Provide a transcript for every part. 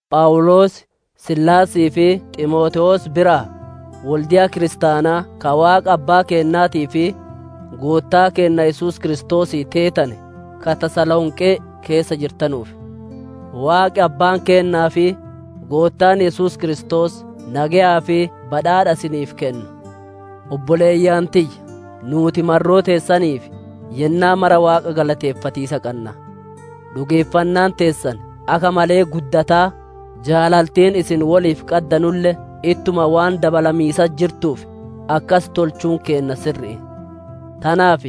Phawuloos, Siilaasii fi Ximootewoos biraa: Wolde'a kiristaanaa ka Waaqa Abbaa keennaatii fi Goottaa keenna Yesuus Kiristoosii teetane, ka Tasalonqee keessa jirtanuuf: Waaqi Abbaan keennaa fi Goottaan Yesuus Kiristoos nageyaa fi badhaadha isiniif kennu. Obboleeyyan tiyya! Nuuti marroo teessaniif yennaa mara Waaqa galateeffatiisa qanna. Dhugeeffannaan teessan akka malee guddataa, jaalaltiin isin woliif qaddanulle ittuma waan dabalamiisatti jirtuuf, akkas tolchuun keenna sirri'i. Tanaaf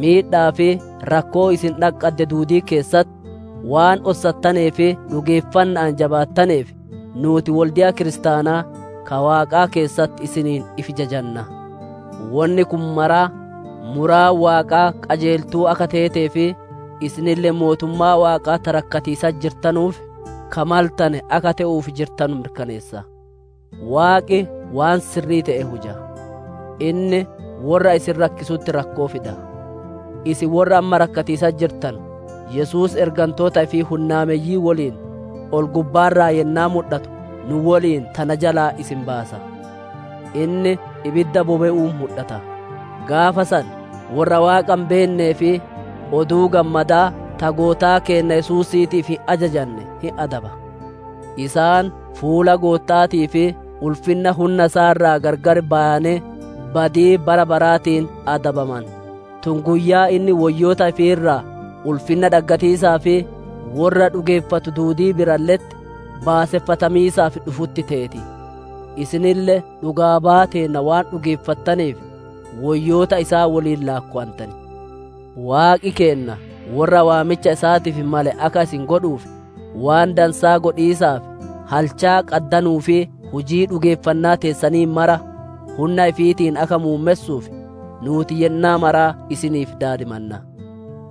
miidha'aa fi rakkoo isin dhaqqadde duudii keessatti waan ossattanee fi dhugeeffanna'aan jabaattaneef, nuuti wolde'oota kiristaanaa, ka Waaqaa keessatti isiniin ifi jajanna. Wonni kun maraa, muraan Waaqaa qajeeltuu akka teetee fi isinille mootummaa Waaqaa ta rakkatiisatti jirtanuuf, ka maltane akka te'uuf jirtanu mirkaneessa. Waaqi waan sirrii te'e huja; inni worra isin rakkisutti rakkoo fida. Isin worra amma rakkatiisatti jirtanu, Yesuus ergantoota ifii hunnaameyyii woliin ol-gubbaa irraa yennaa mudhatu nu woliin tana jalaa isin baasa. Inni ibidda bobe'uun mudhata; gaafa san worra Waaqa hin beennee fi Oduu Gammadaa ta Goottaa keenna Yesuusiitiif hin ajajane hin adaba. Isaan fuula Gootta'aatii fi ulfinna hunna isaa irraa gargar bayanee, badii bara baraatiin adabaman; tun guyyaa inni woyyoota ifii irraa ulfinna dhaggatiisaa fi worra dhugeeffatu duudii biralle'etti baaseffatamiisaaf dhufutti teeti. Isinille dhugaa baya teenna waan dhugeeffattaneef, woyyoota isaa woliin laakkowantan. Waaqi keenna worra waamicha isaatiif male akka isin godhuuf, waan dansaa godhiisaaf halchaa qaddanuu fi hujii dhugeeffannaa teessanii mara hunna ifiitiin akka muummessuuf, nuuti yennaa mara isiniif daadimanna.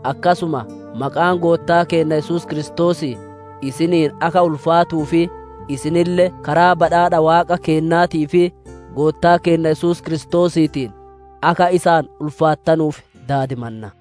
Akkasuma maqaan Goottaa keenna Yesuus Kiristoosii isiniin akka ulfaatuu fi isinille karaa badhaadha Waaqa keennaatii fi Goottaa keenna Yesuus Kiristoosiitiin, akka isaan ulfaattanuuf daadimanna.